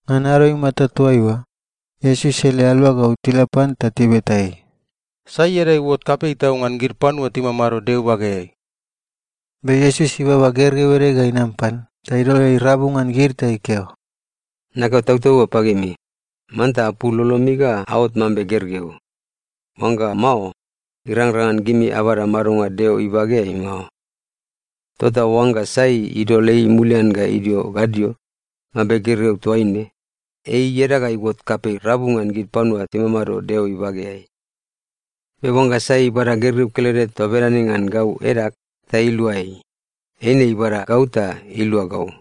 Ngan ado imata toaiua, Iesus ele aluagau tila pan ta tibeta ei, “Sai ieda iuot kapei tau ngan gid panua timamado Deo ibageai?” Be Iesus ibaba gergeu ede ga inam pan ta idol ei rabu ngan gid ta ikeo, “Nakeo tautaunga pagimi, manta apul lolomi ga aot mambe gergeu. Oangga mao, irangrang ngan gimi abada madonga Deo ibageai mao. Tota oangga sai idol ei mulian ga idio gadio, mambe gergeu toaine, ei ieda ga iuot kapei rabu ngan gid panua timamado Deo ibageai. Be oangga sai ibada gergeu kelede toa bedane ngan gau edag ta ilua ei, eine ibada gau ta ilua gau.”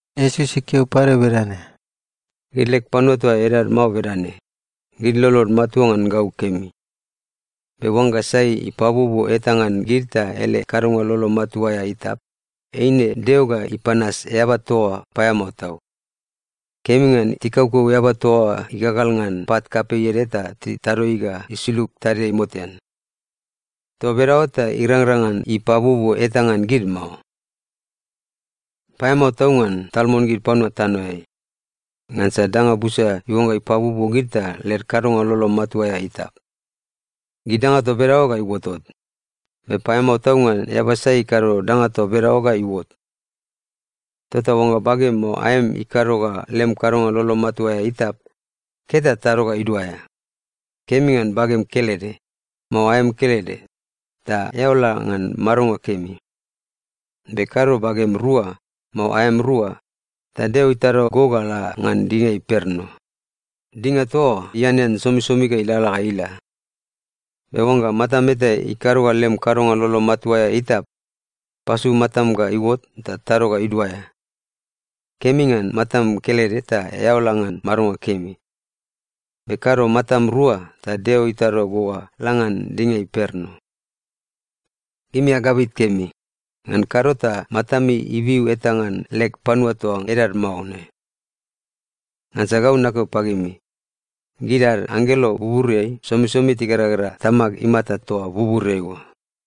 Iesus ikeo pade bedane, “Gid leg panua toa edad mao bedane, gid lolod matua ngan gau kemi. Be oangga sai ipabuobuo eta ngan gid ta ele kadonga lolo matua aea itap, eine Deo ga ipanas eaba toa oa paeamao tau. Kemi ngan tikaukau eaba toa oa igagal ngan pat kapei ede ta titado ei ga isulug tadiai motean! Toa bedaoa ta irangrang ngan ipabuobuo eta ngan gid mao. “Paeamao tau ngan tal mon gid panua tanoeai! Ngansa danga busa iuangga ipabuobuo gid ta led kadonga lolo matua aea itap. Gid danga toa bedaoa ga iuotot. Be paeamao tau ngan eaba sai ikado danga toa bedaoa ga iuot. Tota oangga bagem mao aem ikado ga lem kadonga lolo matua aea itap, ket ta tado ga iduaea! Kemi ngan bagem kelede, mao aem kelede, ta eao la ngan madonga kemi. Be kado bagem rua, mao aem rua, ta Deo itado go ga la ngan dinga imperno. Dinga toa oa ianean somisomi ga ilalala ga ila. Be oangga matam eta ikado ga lem kadonga lolo matua aea itap, pasu matam ga iuot ta tado ga iduaea! Kemi ngan matam kelede ta eao la ngan madonga kemi. Be kado matam rua ta Deo itado go ga la ngan dinga imperno. “Gimi agabit kemi. Ngan kado ta matami ibiu eta ngan leg panua toa edad mao ne. Ngansa gau nakeo pagimi, gid ad anggelo buburiai somisomi tigeragera Tamag imata toa buburiai oa.”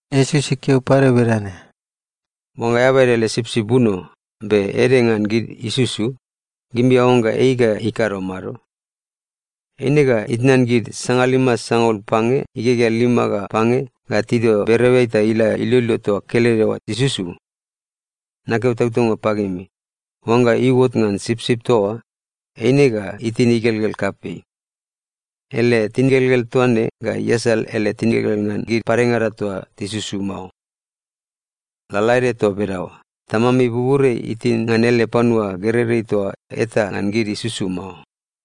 Iesus ikeo pade bedane, “Oangga eaba ede ele sipsip buno, be ede ngan gid isusu, gimi aoangga ei ga ikado mado? Eine ga itnan gid sangalima sangaul pange igegea lima ga pange ga tidio bereoeai ta ila iloilo toa kelede oa isusu. Nakeo tautaunga pagimi, oangga iuot ngan sipsip toa oa, eine ga itin igelgel kapei. Ele tingelgel toa ne ga iasal ele tingelgel ngan gid padengada toa tisusu mao. Lalaede toa bedaoa, Tamami buburiai itin ngan ele panua gereirei toa eta ngan gid isusu mao.”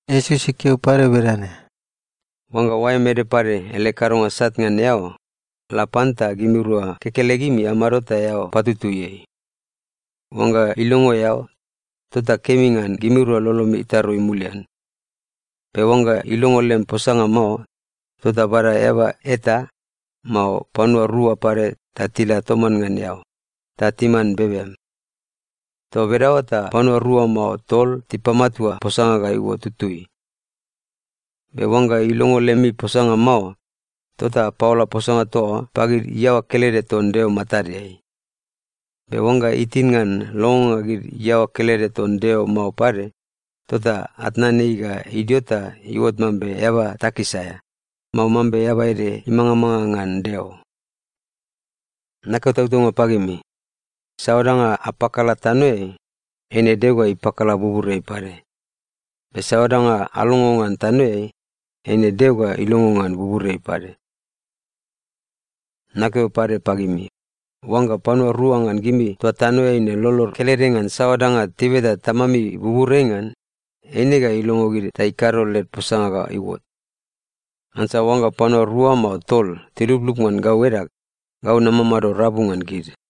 Iesus ikeo pade bedane, “Oangga oaem ede pade ele kadonga sat ngan eao, la pan ta gimirua kekelegimi amado ta eao patutui ei. Oangga ilongo eao, tota kemi ngan gimirua lolomi itarui mulian. Be oangga ilongo lem posanga mao, tota bada eaba eta, mao panua rua pade ta tila toman ngan eao, ta timan bebem. Toa bedaoa ta ‘panua rua mao tol tipamatua posanga ga iuot tutui.’ Be oangga ilongo lemi posanga mao, tota apaola posanga toa oa pagid iaoa kelede ton Deo matadeai. Be oangga itin ngan longonga gid iaoa kelede ton Deo mao pade, tota atnan ei ga idio ta iuot mambe eaba takis aea, mao mambe eaba ede imangamanga ngan Deo. “Nakeo tautaunga pagimi, saoa danga apakala tanoeai, eine Deo ga ipakala buburiai pade, be saoa danga alongo ngan tanoeai, eine Deo ga ilongo ngan buburiai pade. “Nakeo pade pagimi, oangga panua rua ngan gimi toa tanoeai ne lolod kelede ngan saoa danga tibeta Tamami buburiai ngan, eine ga ilongo gid ta ikado led posanga ga iuot. Ngansa oangga panua rua mao tol tiluplup ngan gau edag, gau namamado rabu ngan gid.”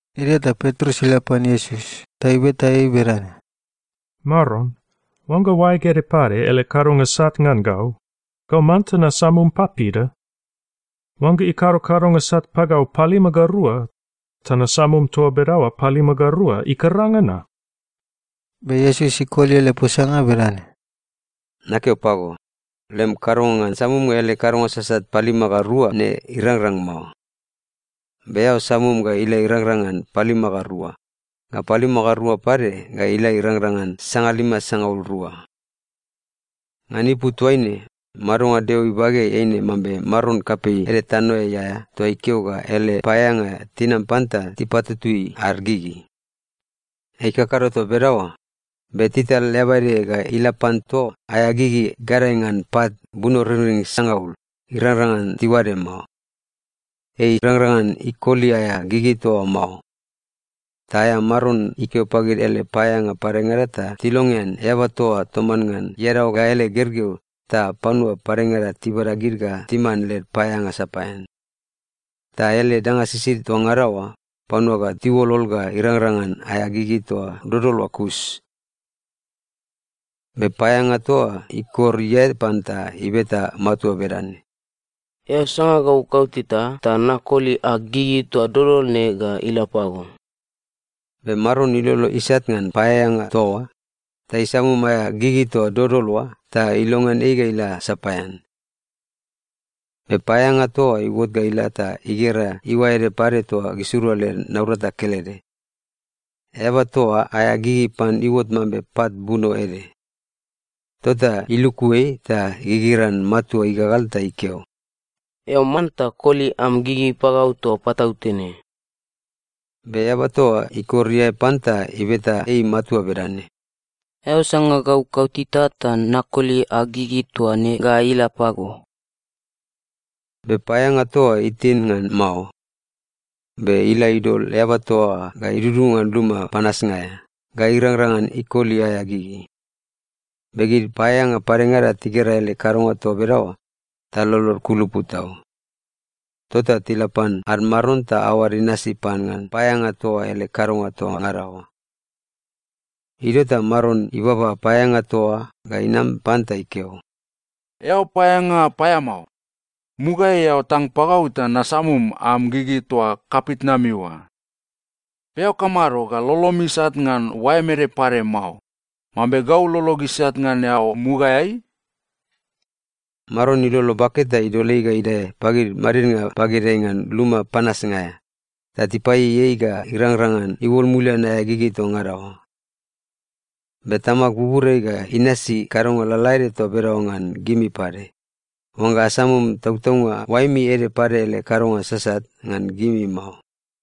Idio ta Petrus ila pan Iesus ta ibeta ei bedane, “Maron, oangga oaeg ede pade ele kadonga sat ngan gau, gau manta nasamum papida? Oangga ikado kadonga sat pagau palima ga rua, ta nasamum toa bedaoa palima ga rua, ikaranga na?” Be Iesus ikoli ele posanga bedane, “Nakeo pago, lem kadonga ngan samumnga ele kadonga sasat palima ga rua ne irangrang mao. Be eao samum ga ila irangrang ngan palima ga rua, ga palima ga rua pade ga ila irangrang ngan sangalima sangaul rua. “Ngan ipu toaine, madonga Deo ibageai eine mambe maron kapei ede tanoeai aea toa ikeo ga ele paeaeanga tinam pan ta tipatutui ad gigi. Ei ikakado toa bedaoa, be tital eaba ede ga ila pan toa aea gigi gadae ngan pat bunoringring sangaul, irangrang ngan tiuade mao. Ei irangrang ngan ikoli aea gigi toa oa mao. Ta aea maron ikeo pagid ele paeaeanga padengada ta tilongean eaba toa oa toman ngan iadaoa ga ele gergeu ta panua padengada tibada gid ga timan led paeaeanga sapaean. Ta ele danga sisid toa ngada oa, panua ga tiuolol ga irangrang ngan aea gigi toa dodol oa kus. “Be paeaeanga toa oa ikor iae pan ta ibeta matua bedane, ‘Eao sanga gau kauteta ta nakoli ag gigi toa dodol ne ga ila pago.’ Be maron ilolo isat ngan paeaeanga toa oa, ta isamum aea gigi toa dodol oa ta ilongean ei ga ila sapaean. “Be paeaeanga toa oa iuot ga ila ta igera iuae ede pade toa gisirua led naurata kelede. Eaba toa oa aea gigi pan iuot mambe pat buno ede. Tota iluku ei ta igigiran matua igagal ta ikeo, ‘Eao manta koli am gigi pagau toa patautene!’ “Be eaba toa oa ikor iae pan ta ibeta ei matua bedane, ‘Eao sanga gau kauteta, ta nakoli ag gigi toa ne ga ila pago.’ “Be paeaeanga toa oa itin ngan mao. Be ila idol eaba toa oa ga idudunga ngan luma panasnga aea, ga irangrang ngan ikoli aea gigi. Be gid paeaeanga padengada tigera ele kadonga toa bedaoa, ta lolod ikulupu tau. Tota tila pan ad maron ta aoad inasi pan ngan paeaeanga toa oa ele kadonga toa ngada oa. “Idio ta maron ibaba paeaeanga toa oa ga inam pan ta ikeo, ‘Eao paeaeanga paeamao! Mugaeai eao tang pagau ta nasamum am gigi toa kapitnami oa. Be eao kamado ga lolom isat ngan oaem ede pade mao, mambe gau lolog isat ngan eao mugaeai?’ Maron ilolo bake ta idol ei ga idae pagid madidnga bagedeai ngan luma panasnga aea, ta tipaieiei ei ga irangrang ngan iuol mulian aea gigi toa ngada oa. “Be Tamag buburiai ga inasi kadonga lalaede toa bedaoa ngan gimi pade, oangga asamum tautaunga oaemi ede pade ele kadonga sasat ngan gimi mao.”